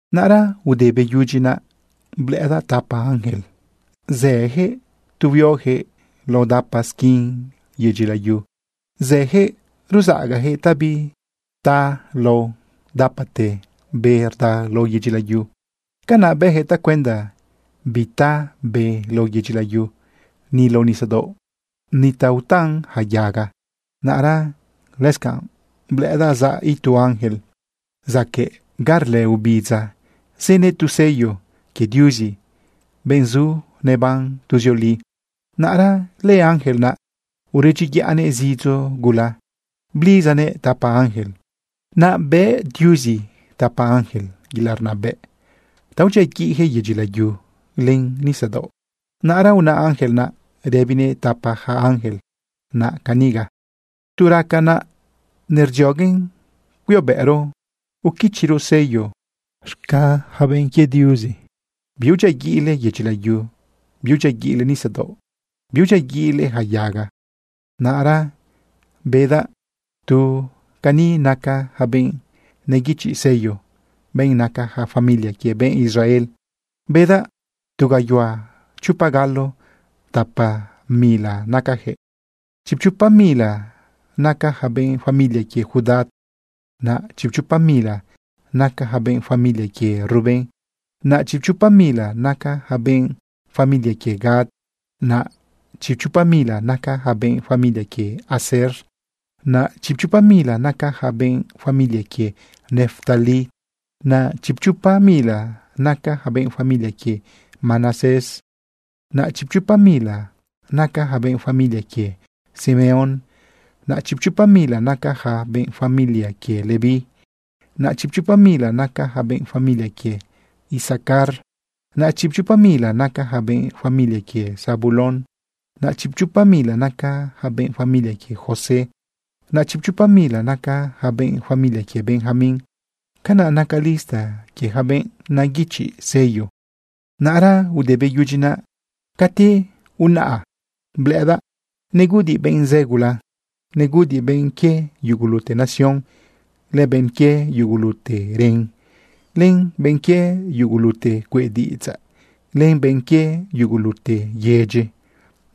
Naꞌra ude beyudyi naꞌ, blëꞌëdaꞌ tapa ángel zëjëꞌ tu huiojëꞌ lao dapa squin yedyi layu. Zëjëꞌ ruzaꞌagajëꞌ ta bita lao dapate be rda lao yedyi layu. Canaꞌ bëjëꞌ tacuenda bita be lao yedyi layu, ni lao nisadaoꞌ, ni ta utan yaca yaga. Naꞌra lëscanꞌ blëꞌëdaꞌ zaꞌ itu ángel zacaꞌ ni ga rlë ubidza, zënëꞌ tu sello quie Diuzi, benꞌ zu neban tuzioli. Naꞌra lëángel naꞌ uredyiyaꞌnëꞌ zidzo gula blidzanëꞌ tapa ángel. Naꞌ bëꞌ Diuzi tapa ángel yelaꞌ rnabëꞌ ta udyiaguiꞌjëꞌ yedyi layu len nisadaoꞌ. Naꞌra una ángel naꞌ rëbinëꞌ tapa ja ángel naꞌ caniga: ―Tu raca naꞌ nerdzioguen cuiobëꞌro uquichiro sello z̃ga ja benꞌ quie Diuzi, biudyiaguiꞌle yedyi layu, biudyiaguiꞌle nisadaoꞌ, biudyiaguiꞌle ja yaga. Naꞌra bedaꞌ tu cani naca ja benꞌ neguichiꞌ sello, benꞌ naca ja familia quie benꞌ Israel. Bedaꞌ tu gayuhua chopa galo tapa mila nacajëꞌ. Chipchopa mila naca ja benꞌ familia quie Judá, naꞌ chipchopa mila naca ja benꞌ familia quie Rubén, naꞌ chipchopa mila naca ja benꞌ familia quie Gad, naꞌ chipchopa mila naca ja benꞌ familia quie Aser, naꞌ chipchopa mila naca ja benꞌ familia quie Neftalí, naꞌ chipchopa mila naca ja benꞌ familia quie Manasés, naꞌ chipchopa mila naca ja benꞌ familia quie Simeón, naꞌ chipchopa mila naca ja benꞌ familia quie Leví, naꞌ chipchopa mila naca ja benꞌ familia quie Isacar, naꞌ chipchopa mila naca ja benꞌ familia quie Zabulón, naꞌ chipchopa mila naca ja benꞌ familia quie José, naꞌ chipchopa mila naca ja benꞌ familia quie Benjamín. Canaꞌ naca lista quie ja benꞌ neguichiꞌ sello. Naꞌra ude beyudyi naꞌ, cati unaꞌa blëꞌëdaꞌ neguꞌudiꞌ benꞌ zë gula. Neguꞌudiꞌ benꞌ quie yugulute nación, len benꞌ quie yugulute ren, len benꞌ quie yugulute cueꞌ diꞌidzaꞌ, len benꞌ quie yugulute yedyi.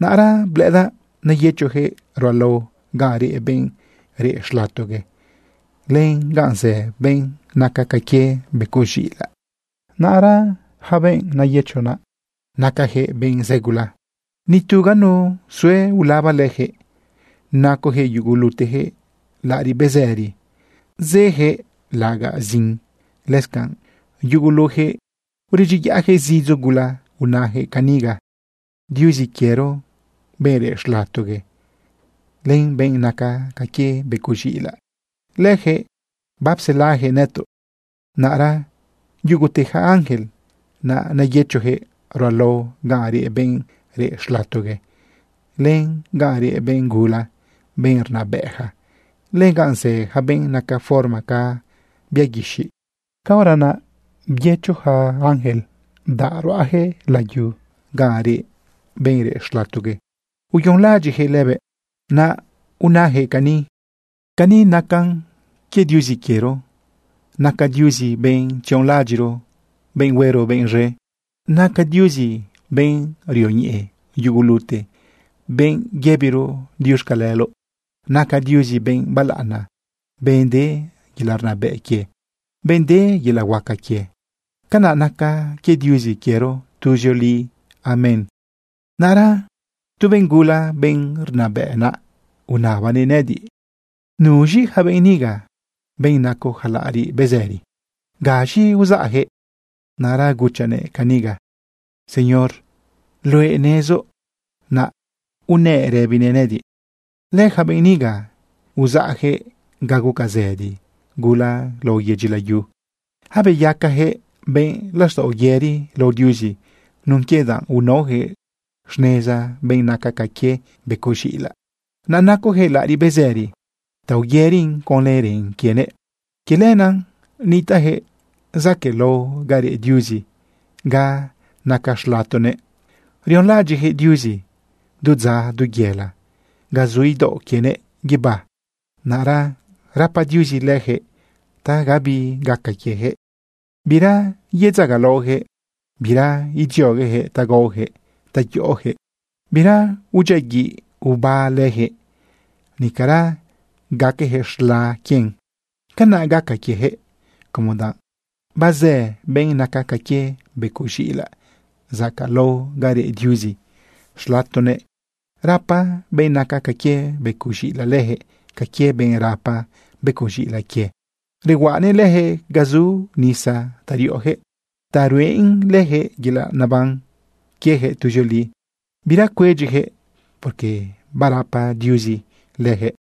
Naꞌra blëꞌëdaꞌ neyëchojëꞌ ruꞌalao ganꞌ reꞌ benꞌ reꞌ xlatogue, len ganꞌ zë benꞌ naca ca quie becoꞌ z̃iꞌilaꞌ. Naꞌra benꞌ neyëcho naꞌ, nacajëꞌ benꞌ zë gula. Nitu ganu sue ulaba lëjëꞌ. Nacojëꞌ yugulutejëꞌ laꞌariꞌ bezëri, zëjëꞌ laꞌagaꞌ zin. Lëscanꞌ yugulujëꞌ uredyiyaꞌjëꞌ zidzo gula unajëꞌ caniga: Diuzi quiero, benꞌ reꞌ xlatogue, len benꞌ naca ca quie becoꞌ z̃iꞌilaꞌ, lëjëꞌ bapselajëꞌ nëtoꞌ. Naꞌra yugute ja ángel naꞌ neyëchojëꞌ ruꞌalao ganꞌ reꞌ benꞌ reꞌ xlatogue, len ganꞌ reꞌ benꞌ gula, benꞌ rnabëꞌja, len ganꞌ zë yaca benꞌ naca forma ca bia guixiꞌ. Caora naꞌ byëcho ja ángel, bdaꞌ ruꞌajëꞌ layu ganꞌ reꞌ benꞌ reꞌ xlatogue, uyonlaꞌadyiꞌjëꞌ lëbëꞌ. Naꞌ unajëꞌ cani: Cani nacan quie Diuzi quiero. Naca Diuzi benꞌ tzionlaꞌadyiꞌro, benꞌ huero benꞌ z̃e. Naca Diuzi benꞌ rioñeꞌe yugulute, benꞌ yëbiro diuxcaleloꞌ. Naca Diuzi benꞌ balaꞌana, benꞌ de yelaꞌ rnabëꞌ quie, benꞌ de yelaꞌ huaca quie. Canaꞌ nacan quie Diuzi quiero tuzioli. Amén. Naꞌra tu benꞌ gula, benꞌ rnabëꞌ naꞌ, unabanëꞌ nëꞌëdiꞌ caniga: ―¿Nuz̃i ja benꞌ niga, benꞌ naco ja laꞌariꞌ bezëri? ¿Gaz̃i uzaꞌjëꞌ? Naꞌra guchaꞌnëꞌ caniga: ―Señor, luëꞌ nezoꞌ. Naꞌ unëꞌ rëbinëꞌ nëꞌëdiꞌ: ―Lëja benꞌ niga uzaꞌjëꞌ ga guca zëdi gula lao yedyi layu. Abeyacajëꞌ benꞌ laxtaꞌo yëri lao Diuzi nun quie danꞌ unaojëꞌ xneza benꞌ naca ca quie becoꞌ z̃iꞌilaꞌ. Naꞌ nacojëꞌ laꞌariꞌ bezëri ta uyërin conlë ren quienëꞌ. Quie lenaꞌ nitaꞌjëꞌ zaquëꞌlao ga reꞌ Diuzi ga naca xlatonëꞌ. Rionlaꞌadyiꞌjëꞌ Diuzi du dza, du yela, ga zu idaoꞌ quienëꞌ guibá. Naꞌra rapa Diuzi lëjëꞌ ta gabi gaca quiejëꞌ. Bira yedzagalaojëꞌ, bira idzioguejëꞌ ta gaojëꞌ ta yoꞌojëꞌ. Bira udyiaguiꞌ oba lëjëꞌ, nicara gaquejëꞌ z̃la quien. Canaꞌ gaca quiejëꞌ como danꞌ bazë benꞌ naca ca quie becoꞌ z̃iꞌilaꞌ zacaꞌlao ga reꞌ Diuzi xlatoguëꞌ. Rapa benꞌ naca ca quie becoꞌ z̃iꞌilaꞌ lëjëꞌ ca quie benꞌ rapa becoꞌ z̃iꞌilaꞌ quie. Rehuaꞌanëꞌ lëjëꞌ ga zu nisa ta riꞌojëꞌ ta ruꞌen lëjëꞌ yelaꞌ neban quiejëꞌ tuzioli. Bira cuedyijëꞌ, porque barapa Diuzi lëjëꞌ.